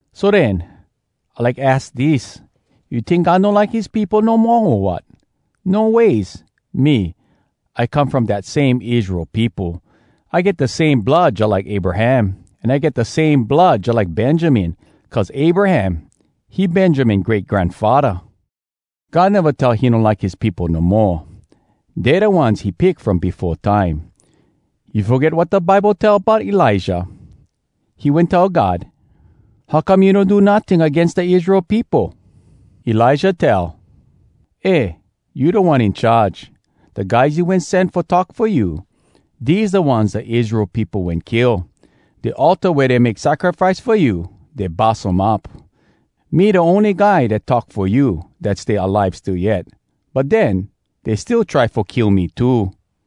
So den, I like aks dis: You tink God no like his peopo no moa, o wat? No ways! Me, I come from dat same Israel peopo! I get da same blood jalike Abraham, an I get da same blood jalike Benjamin, cuz Abraham, he Benjamin great granfaddah. God neva tell he no like his peopo no moa. Dey da ones he pick from befo time. You foget wat da Bible tell bout Elijah? He wen tell God, “How come you no do notting agains da Israel peopo?!” Elijah tell: “Eh, You Da One In Charge! Da guys you wen sen fo talk fo you, Dese da ones da Israel peopo wen kill! Da altar wea dey make sacrifice fo you, Dey bus um up. Me da ony guy dat talk fo you Dat stay alive still yet. But den, dey still try fo kill me too!”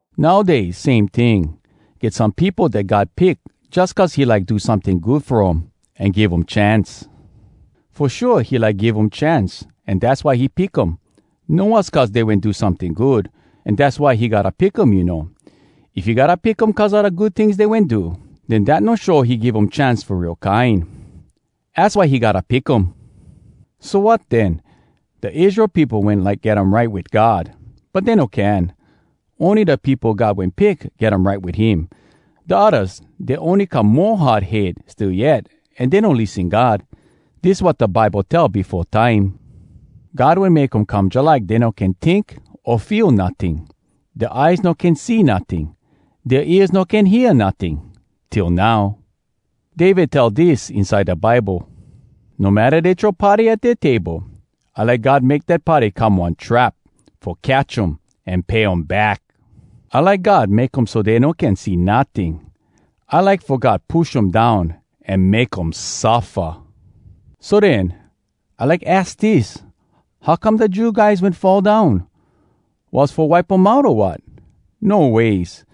Nowdays, same ting—get some peopo dat God pick jus cuz he like do someting good fo um an give um chance. Fo shua, he like give um chance an dass why he pick um. No was cuz dey wen do someting good, an dass why he gotta pick um, you know. If he gotta pick um cuz a da good tings dey wen do, den dat no show he give um chance fo real kine. Az why he gotta pick um. So wat, den? Da Israel peopo wen like get um right wit God, but dey no can. Ony da peopo God wen pick get um right wit him. Da oddas, dey ony come mo hard head still yet an dey no lissen God. Dis wat da Bible tell befo time: “God wen make um come Jalike dey no can tink o feel notting. Dea eyes no can see notting, Dea ears no can hear notting, Till now.” David tell dis inside da Bible: “No matta dey throw party at dea table— I like God make dat party come one trap Fo catch um an pay um back! I like God make um so dey no can see notting! I like fo God push um down an make um suffa!” So den, I like aks dis: How come da Jew guys wen fall down? Was fo wipe um out, o wat? No ways!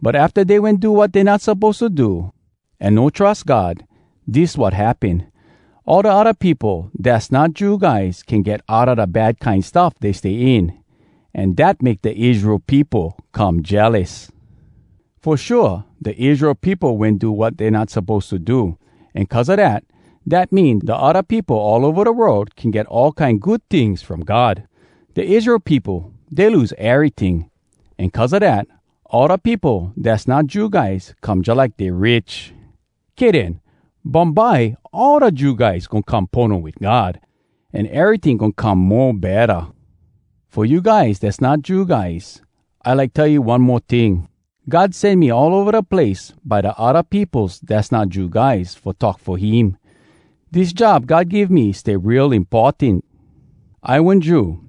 But afta dey wen do wat dey not suppose to do, an no trus God, dis wat happen. All da odda peopo dass not Jew guys can get outa da bad kine stuff dey stay in. An dat make da Israel peopo come jealous. Fo shua, da Israel peopo wen do wat dey not suppose to do. An cuz a dat, dat mean, da odda peopo all ova da world can get all kine good tings from God. Da Israel peopo, dey lose eryting, an cuz a dat, all da peopo dass not Jew guys come jalike dey rich! Kay den—bumbye, all da Jew guys goin come pono wit God, an eryting goin come mo betta! Fo you guys dass not Jew guys, I like tell you one mo ting: God sen me all ova da place by da odda peopos dass not Jew guys fo talk fo him. Dis job God give me stay real importan! I one Jew,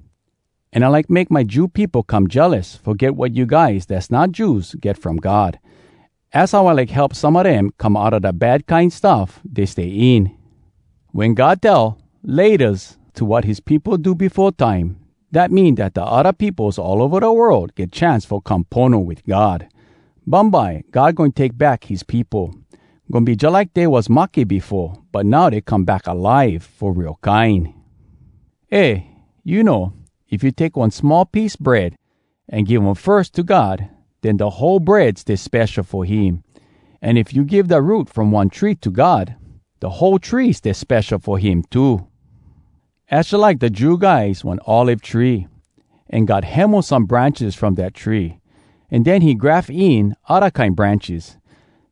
an I like make my Jew peopo come jealous fo get wat you guys dass not Jews get from God. Az how I like help some a dem come outa da bad kine stuff dey stay in. Wen God tell “Laytas” to wat his peopo do befo time, dat mean dat da odda peopos all ova da world get chance fo come pono wit God. Bumbye, God goin take back his peopo. Goin be jalike dey was mahke befo, but now dey come back alive fo real kine! Eh, you know, if you take one small piece bread, an give um firs to God, den da whole bread stay spesho fo him. An if you give da root from one tree to God, da whole tree stay spesho fo him too. Az jalike da Jew guys one olive tree, an God hemo some branches from dat tree, an den he graf in odda kine branches.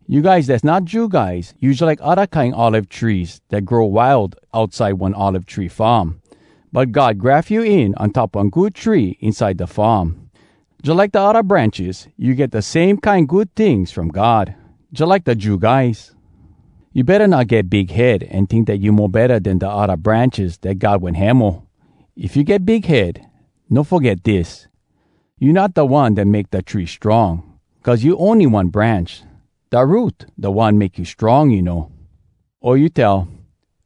You guys dass not Jew guys, you jalike odda kine olive trees dat grow wild outside one olive tree farm, but God graf you in on top one good tree inside da farm. Jalike da odda branches, you get da same kine good tings from God, jalike da Jew guys. You betta not get big head an tink dat you mo betta den da odda branches dat God wen hemo! If you get big head, no foget dis—you not da one dat make da tree strong, cuz you ony one branch. Da root, da one make you strong, you know! O you tell,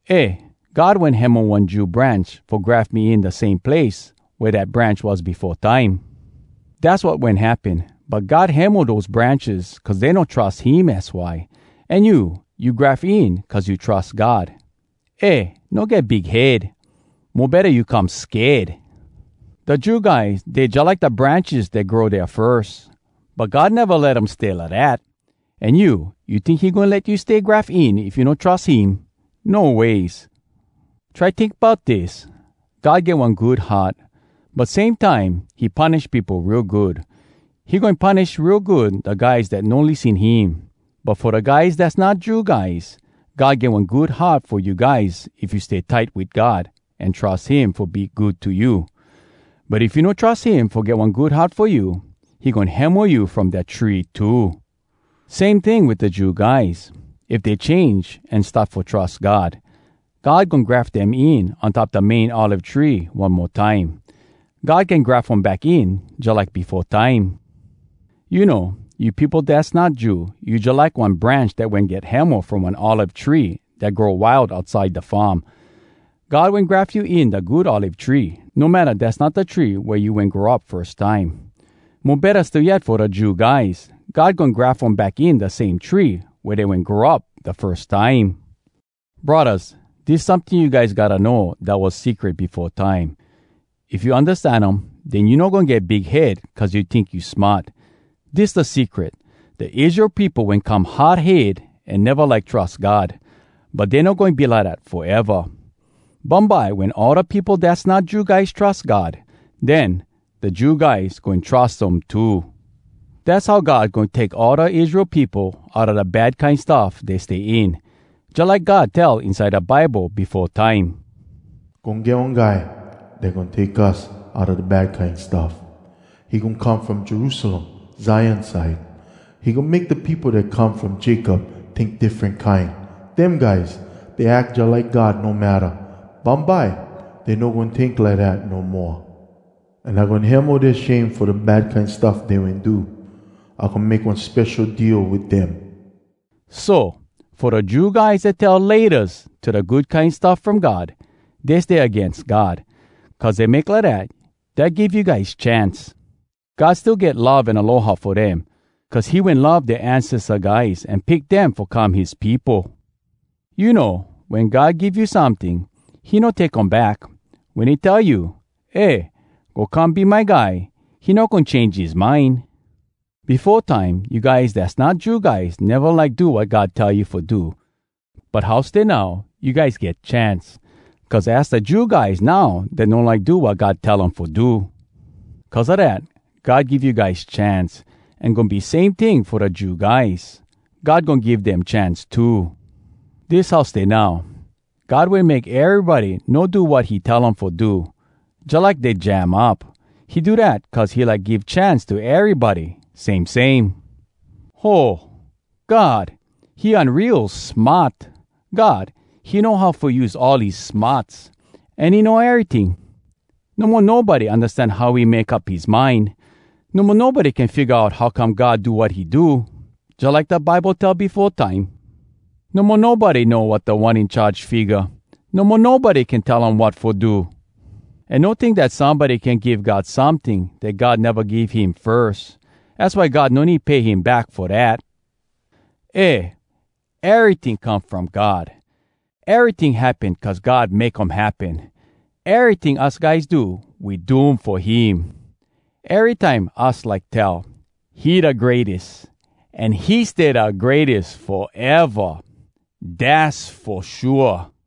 “Eh, God wen hemo one Jew branch fo graf me in da same place wea dat branch was befo time.” Dass wat wen happen, but God hemo dose branches cuz dey no trus him, az why. An you, you graf in cuz you trus God. Eh, no get big head! Mo betta you come sked! Da Jew guys, dey jalike da branches dat grow dea firs—but God neva let um stay lidat. An you? You tink he goin let you stay graf in if you no trus him? No ways! Try tink bout dis: God get one good heart—but same time, he punish peopo real good. He goin punish real good da guys dat no lissen him. But fo da guys dass not Jew guys, God get one good heart fo you guys if you stay tight wit God an trus him fo be good to you. But if you no trus him fo get one good heart fo you, he goin hemo you from da tree too. Same ting wit da Jew guys, if dey change an start fo trus God, God goin graf dem in on top da main olive tree one mo time. God can graf um back in jalike befo time. You know, you peopo dass not Jew, you jalike one branch dat wen get hemo from one olive tree dat grow wild outside da farm. God wen graf you in da good olive tree, no matta dass not da tree wea you wen grow up firs time. Mo betta still yet fo da Jew guys, God goin graf um back in da same tree wea dey wen grow up da firs time. Braddahs, dis someting you guys gotta know dat was secret befo time. If you undastan um, den you no goin get big head cuz you tink you smart. Dis da secret: Da Israel peopo wen come hard head an neva like trus God, but dey no goin be lidat foeva. Bumbye wen all da peopo dass not Jew guys trus God, den da Jew guys goin trus um too. Dass how God goin take all da Israel peopo outa da bad kine stuff dey stay in, jalike God tell inside da Bible befo time: “Goin get one guy dat goin take us outa da bad kine stuff, He goin come from Jerusalem, Zion side. He goin make da peopo dat come from Jacob tink diffren kine, Dem guys, dey ack jalike God no matta, Bumbye, dey no goin tink lidat no moa. An I goin hemo dea shame fo da bad kine stuff dey wen do. I goin make one spesho deal wit dem” So, fo da Jew guys dat tell “Laytas” to da Good Kine Stuff From God, dey stay agains God. Cuz dey make lidat, dat give you guys chance! God still get love an aloha fo dem, cuz he wen love dea ancesta guys an pick dem fo come his peopo. You know, wen God give you someting, he no take um back. Wen he tell you, “Eh! Go come be my guy!”—he no goin change his mind. Befo time, you guys dass not Jew guys neva like do wat God tell you fo do. But how stay now, you guys get chance, cuz az da Jew guys now dat no like do wat God tell um fo do. Cuz a dat, God give you guys chance. An goin be same ting fo da Jew guys. God goin give dem chance too. Dis how stay now, God wen make erybody no do wat he tell um fo do, jalike dey jam up. He do dat cuz he like give chance to erybody, same same. Ho, God! He unreals smart! God, he know how fo use all his smarts! An he know eryting! No mo nobody undastan how he make up his mind! No mo nobody can figga out how come God do wat he do! Jalike da Bible tell befo time: “No mo nobody know wat Da One In Charge figga! No mo nobody can tell um wat fo do! An no tink dat somebody can give God someting Dat God neva give him firs! Az why God no need pay him back fo dat.” Eh, eryting come from God! Eryting happen cuz God make um happen! Eryting us guys do, We do um fo him! Erytime us like tell, He da greates, An he stay da greates foeva! Dass fo shua!